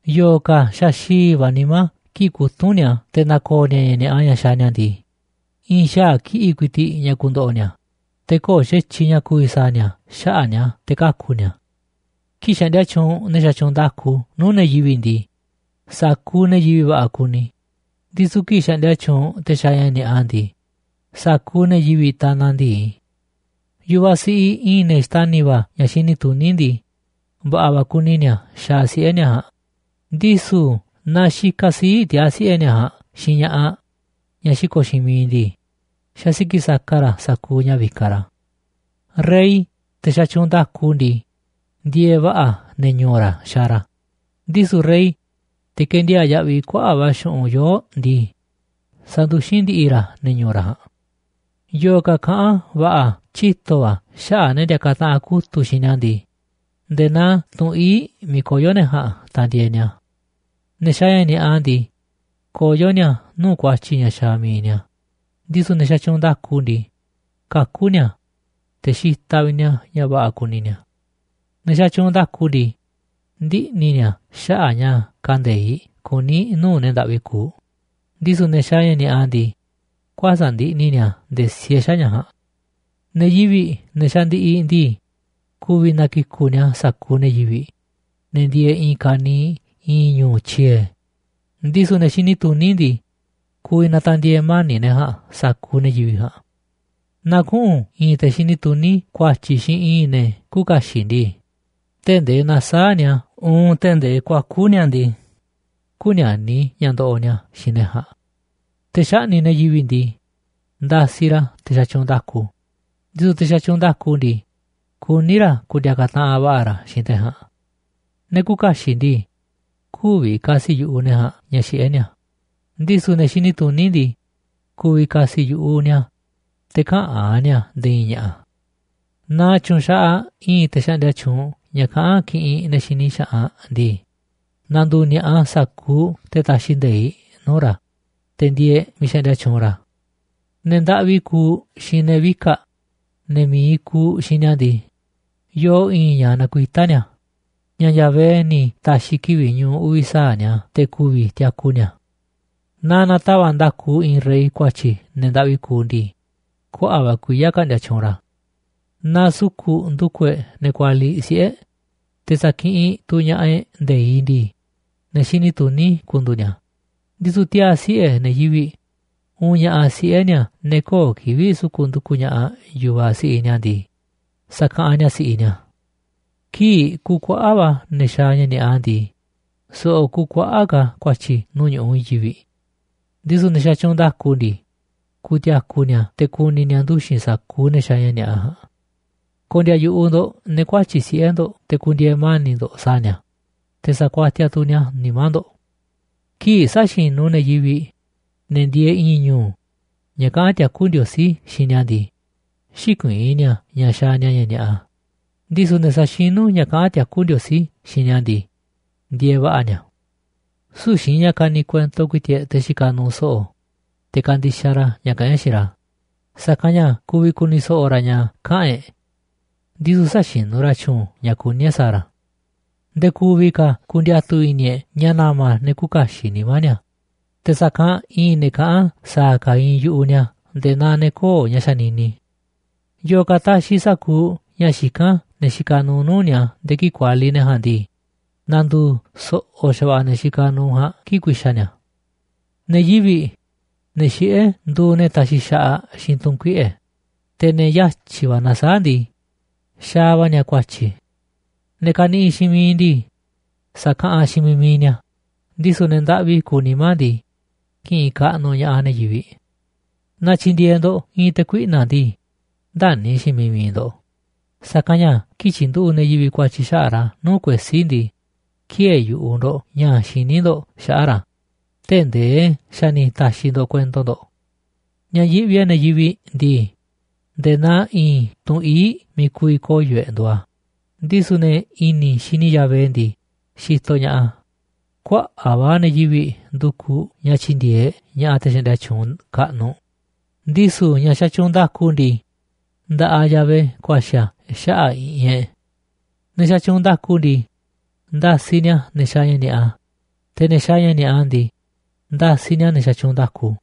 Yo̱o̱ ka̱ xaxi̱i̱ va̱ nimá kii̱ꞌ kutúnꞌ ni̱a̱ te̱ na̱ko̱o̱ ni̱a̱ ña̱ ni̱a̱ꞌa ña̱ xaaꞌ ni̱a̱ ndii, i̱i̱n xaa̱ kiꞌi̱ꞌ ku̱i̱ti̱ꞌ ña̱ ku̱ndo̱ꞌo̱ ni̱a̱, te̱ köo̱ꞌ xa̱tyiꞌ ña̱ ku̱vi̱ sa̱a̱ ni̱a̱ xaꞌa̱ꞌ ni̱a̱ te̱ kaku̱ ni̱a̱. Kii̱ꞌ xaꞌndia tyuunꞌ ne̱ xatyuunꞌ nda̱ku nuu̱ꞌ ne̱ yivi̱ꞌ ndii, sa̱kuuꞌ ne̱ yivi̱ꞌ va̱ꞌa̱ kuni, ndisu̱ kii̱ꞌ xaꞌndia tyuunꞌ te̱ xaaꞌ ña̱ ni̱a̱ꞌa ndii, sa̱kuuꞌ ne̱ yivi̱ꞌ tanaꞌ ndi̱i. Yu̱vaꞌ siꞌiꞌ i̱i̱n ne̱ xtani̱ va̱ ña̱ xini tuní ndii, va̱ꞌa̱ va̱ kuni ni̱a̱ xaaꞌ siꞌe̱ ni̱a̱ ja̱a̱nꞌ, ndisu̱ naaꞌ xikaꞌ sii̱ꞌ tiaa̱ siꞌe̱ ni̱a̱ ja̱a̱nꞌ xiinꞌ ña̱ꞌaꞌ ñaꞌ xiko̱ꞌ xiinꞌ miiꞌ ndii, xasiki̱ꞌ saka ra̱ sa̱kuuꞌ ña̱ vikaꞌ ra̱. Rey, te̱ xatyuunꞌ nda̱ku ndii, ndieeꞌ va̱ꞌa̱ ne̱ ñu̱u̱ ra̱ xaaꞌ ra̱, ndisu̱ rey, te̱ ke̱ndiaa̱ꞌ yaꞌviꞌ kuaꞌa̱ꞌ va̱ xu̱ꞌunꞌ yoo̱ꞌ ndii, sanduxín ndi̱ꞌi̱ ra̱ ne̱ ñu̱u̱ ra̱ ja̱a̱nꞌ. Yo̱o̱ ka̱ kaꞌán va̱ꞌa̱ tyito̱ va̱ xaꞌa̱ꞌ ne̱ ndiakaꞌ taꞌanꞌ kutu̱ꞌ xiinꞌ ni̱a̱ ndii, nde̱e̱ naa tunꞌ ii̱ꞌ miiꞌ koyo̱ ne̱ ja̱a̱nꞌ tandieeꞌ ni̱a̱. Ne̱ xaaꞌ ña̱ ni̱a̱ꞌa ndii, koyó ni̱a̱ nuu̱ꞌ ku̱a̱tyi̱ ña̱ xaaꞌ mi̱iꞌ ni̱a̱, ndisu̱ ne̱ xatyuunꞌ nda̱ku ndii, kakú ni̱a̱, te̱ xitaꞌ vi̱ꞌ ni̱a̱ ña̱ va̱ꞌa̱ kuni ni̱a̱. Ne̱ xatyuunꞌ nda̱ku ndii, ndiꞌni̱ ni̱a̱ xaꞌa̱ꞌ ña̱ kande̱iꞌ kuní nuu̱ꞌ ne̱ ndaꞌvi kuuꞌ, ndisu̱ ne̱ xaaꞌ ña̱ ni̱a̱ꞌa ndii, kuäsa̱ꞌ ndiꞌni̱ ni̱a̱ nde̱e̱ siee xaꞌa̱ꞌ ña̱ ja̱a̱nꞌ. Ne̱ yivi̱ꞌ, ne̱ xandiꞌiꞌ ndii, ku̱vi̱ na̱kiku̱ꞌ ni̱a̱ sa̱kuuꞌ ne̱ yivi̱ꞌ, ne̱ ndieeꞌ i̱i̱n ka̱niiꞌ i̱i̱n ñu̱u̱ tyie̱, ndisu̱ ne̱ xini tuní ndii, ku̱vi̱ na̱ta̱ndi̱e̱e̱ mani̱ꞌ ne̱ ja̱a̱nꞌ sa̱kuuꞌ ne̱ yivi̱ꞌ ja̱a̱nꞌ. Naaꞌ kuꞌu̱n i̱i̱n te xini tuní ku̱a̱tyi̱ xiinꞌ i̱i̱n ne̱ küuꞌ kaxiꞌ ndii, tee̱ꞌ ndee na̱saa̱ꞌ ni̱a̱ uun tee̱ꞌ ndee kuaku̱ ni̱a̱ ndii, kü̱ni̱a̱ni̱ ña̱ ndoꞌoꞌ ni̱a̱ xiinꞌ ne̱ ja̱a̱nꞌ. Te̱ xaꞌni̱ꞌ ne̱ yivi̱ꞌ ndii, ndasiꞌ ra̱ te̱ xatyuunꞌ nda̱ku, ndisu̱ te̱ xatyuunꞌ nda̱ku ndii, kuní ra̱ ku̱ndi̱a̱ka̱ taꞌanꞌ va̱ꞌa̱ ra̱ xiinꞌ te̱ ja̱a̱nꞌ. Ne̱ küuꞌ kaxiꞌ ndii, kü̱vi̱ ka̱si̱ yu̱ꞌuꞌ ne̱ ja̱a̱nꞌ ña̱ xiꞌé ni̱a̱, ndisu̱ ne̱ xini tuní ndii, ku̱vi̱ ka̱si̱ yu̱ꞌuꞌ ni̱a̱ a̱, te̱ käꞌán ni̱a̱ nde̱e̱ i̱i̱n ña̱ꞌa̱. Naaꞌ tyu̱nxaꞌaꞌ i̱i̱n te̱ xaꞌndia tyuunꞌ ña̱ kaꞌán kiꞌinꞌ ne̱ xini xaꞌanꞌ ndii, na̱ndu̱u̱ ni̱a̱ꞌa sa̱kuuꞌ te̱ taxiꞌ nde̱iꞌ nuu̱ꞌ ra̱, te̱ ndieeꞌ miiꞌ xaꞌndia tyuunꞌ ra̱. Ne̱ ndaꞌvi kuuꞌ xiinꞌ ne̱ vika̱ꞌ, ne̱ mi̱iꞌ kuuꞌ xiinꞌ ni̱a̱ ndii, yoo i̱i̱n ña̱ nakuitá ni̱a̱, ña̱ Yahvé ni̱ ta̱xi̱ kivi̱ꞌ ñu̱u̱ uvi̱ sa̱aꞌ ni̱a̱ te̱ ku̱vi̱ tiaku ni̱a̱. Naaꞌ na̱tava̱ꞌ nda̱ku i̱i̱n rey ku̱a̱tyi̱ ne̱ ndaꞌvi kuuꞌ ndii, kuaꞌa̱ꞌ va̱ kuiya̱ ka̱ꞌndi̱a̱ tyuunꞌ ra̱. Naaꞌ su̱ku̱ꞌ ndu̱ku̱ e̱ꞌ ne̱ kualiꞌ siꞌe̱ e̱ꞌ, te̱ sa̱kiꞌinꞌ tu̱ ña̱ꞌaꞌ e̱ꞌ nde̱iꞌ ndii, ne̱ xini tuní ku̱ndu̱u̱ ni̱a̱, ndisu̱ tiaa̱ siꞌe̱ ne̱ yivi̱ꞌ uunꞌ ña̱ꞌaꞌ siꞌe̱ ni̱a̱ ne̱ köo̱ꞌ kivi̱ꞌ suku̱ꞌ ndu̱ku̱ ña̱ꞌaꞌ yu̱vaꞌ siꞌiꞌ ni̱a̱ ndii, sa̱kaꞌanꞌ ni̱a̱ si̱ꞌiꞌ ni̱a̱. Kii̱ꞌ kuuꞌ kuaꞌa̱ꞌ va̱ ne̱ xaaꞌ ña̱ ni̱a̱ꞌa ndii, so̱ꞌo̱ kuuꞌ kuaꞌa̱ꞌ ka̱ ku̱a̱tyi̱ nuu̱ꞌ ñu̱ꞌuꞌ i̱i̱n yivi̱ꞌ, ndisu̱ ne̱ xatyuunꞌ nda̱ku ndii, ku̱ti̱a̱ku̱ ni̱a̱ te̱ ku̱ni̱ ni̱a̱ nduxi̱n sa̱kuuꞌ ne̱ xaaꞌ ña̱ ni̱a̱ꞌa ja̱a̱nꞌ. Ko̱ndi̱a̱ yu̱ꞌuꞌ ndo̱ꞌ ne̱ kuatyi̱ꞌ siꞌe̱ ndo̱ꞌ te̱ ku̱ndi̱e̱e̱ mani̱ꞌ ndo̱ꞌ sa̱a̱ ni̱a̱, te̱ sa̱kuatiaꞌ tu̱ ni̱a̱ nimá ndo̱ꞌ. Kii̱ꞌ säxinú ne̱ yivi̱ꞌ, ne̱ ndieeꞌ i̱i̱n ñu̱u̱ ña̱ kaꞌán tiakú Ndiosí xiinꞌ ni̱a̱ ndii, xïkuiín ni̱a̱ ña̱ xaaꞌ ni̱a̱ ña̱ ni̱a̱ꞌa, ndisu̱ ne̱ saxinú ña̱ kaꞌán tiakú Ndiosí xiinꞌ ni̱a̱ ndii, ndieeꞌ va̱ꞌa̱ ni̱a̱. Süu̱ꞌ xiinꞌ ña̱ kaniꞌ kuento ku̱i̱ti̱ꞌ e̱ꞌ te̱ xikaꞌ nuuꞌ so̱ꞌo̱, te̱ kandixaꞌ ra̱ ña̱ kaꞌán e̱ꞌ xiinꞌ ra̱, sa̱kanꞌ ña̱ ku̱vi̱ ku̱ni̱ so̱ꞌo̱ ra̱ ña̱ kaꞌa̱n e̱ꞌ, ndisu̱ säxinú ra̱ tyu̱u̱n ña̱ kuní e̱ꞌ sa̱a̱ ra̱. Nde̱e̱ ku̱vi̱ ka̱ ku̱ndi̱a̱tu̱ i̱ni̱ e̱ꞌ ña̱ na̱ma̱ ne̱ küuꞌ kaxiꞌ nimá ni̱a̱, te̱ sa̱kanꞌ i̱i̱n ne̱ kaꞌán sa̱a̱ ka̱ iinꞌ yu̱ꞌuꞌ ni̱a̱ nde̱e̱ naa ne̱ köo̱ꞌ ña̱ xanini. Yo̱o̱ ka̱ taxiꞌ sa̱kuuꞌ ña̱ xikán ne̱ xikaꞌ nuuꞌ nuu̱ꞌ ni̱a̱ nde̱e̱ kii̱ꞌ kualiꞌ ne̱ ja̱a̱nꞌ ndii, na̱ndu̱u̱ so̱ꞌo̱ xa̱va̱ꞌa̱ ne̱ xikaꞌ nuuꞌ ja̱a̱nꞌ kii̱ꞌ ku̱i̱xa̱ ni̱a̱. Ne̱ yivi̱ꞌ, ne̱ xiꞌé, nduuꞌ ne̱ taxiꞌ xaꞌaꞌ xiinꞌ tu̱ꞌu̱n kuiꞌe̱, te̱ ne̱ yatyi̱ va̱ nasaáꞌ ndii, xaaꞌ va̱ ni̱a̱ ku̱a̱tyi̱. Ne̱ kaniꞌiꞌ xiinꞌ miiꞌ ndii, sa̱kaꞌanꞌ xiinꞌ miiꞌ mi̱iꞌ ni̱a̱, ndisu̱ ne̱ ndaꞌvi kuuꞌ nimá ndii, ki̱ꞌi̱n kaꞌnuꞌ ña̱ꞌaꞌ ne̱ yivi̱ꞌ. Naaꞌ tyi̱ndi̱e̱eꞌ ndo̱ꞌ i̱i̱n te̱ kuiꞌna̱ꞌ ndii, ndäni̱ xiinꞌ miiꞌ mi̱iꞌ ndo̱ꞌ, sa̱kanꞌ ña̱ kii̱ꞌ tyi̱nduꞌu̱ꞌ ne̱ yivi̱ꞌ ku̱a̱tyi̱ xaꞌa̱ꞌ ra̱ nuu̱ꞌ kuesí ndii, ki̱ë̱e̱ yu̱ꞌuꞌ ndo̱ꞌ ña̱ xiní ndo̱ꞌ xaꞌa̱ꞌ ra̱ tee̱ꞌ ndee xa̱ ni̱ ta̱xi̱ ndo̱ꞌ kuento ndo̱ꞌ. Ña̱ yiꞌvi e̱ꞌ ne̱ yivi̱ꞌ ndii, nde̱e̱ naa i̱i̱n tunꞌ ii̱ꞌ miiꞌ ku̱vi̱ koyo̱ e̱ꞌ nduuꞌ a̱, ndisu̱ ne̱ i̱ni̱ xini Yahvé ndii, xitoꞌ ña̱ꞌaꞌ a̱. Kuaꞌa̱ꞌ va̱ ne̱ yivi̱ꞌ ndukuꞌ ña̱ tyi̱ndi̱e̱eꞌ ña̱ꞌaꞌ te̱ xaꞌndia tyuunꞌ kaꞌnuꞌ, ndisu̱ ña̱ xatyuunꞌ nda̱ku ndii, nda̱ꞌaꞌ Yahvé ku̱a̱xi̱ a̱ xaꞌa̱ꞌ i̱ꞌi̱n e̱ꞌ. Ne̱ xatyuunꞌ nda̱ku ndii, ndasiꞌ ni̱a̱ ne̱ xaaꞌ ña̱ ni̱a̱ꞌa, te̱ ne̱ xaaꞌ ña̱ ni̱a̱ꞌa ndii, ndasiꞌ ni̱a̱ ne̱ xatyuunꞌ nda̱ku.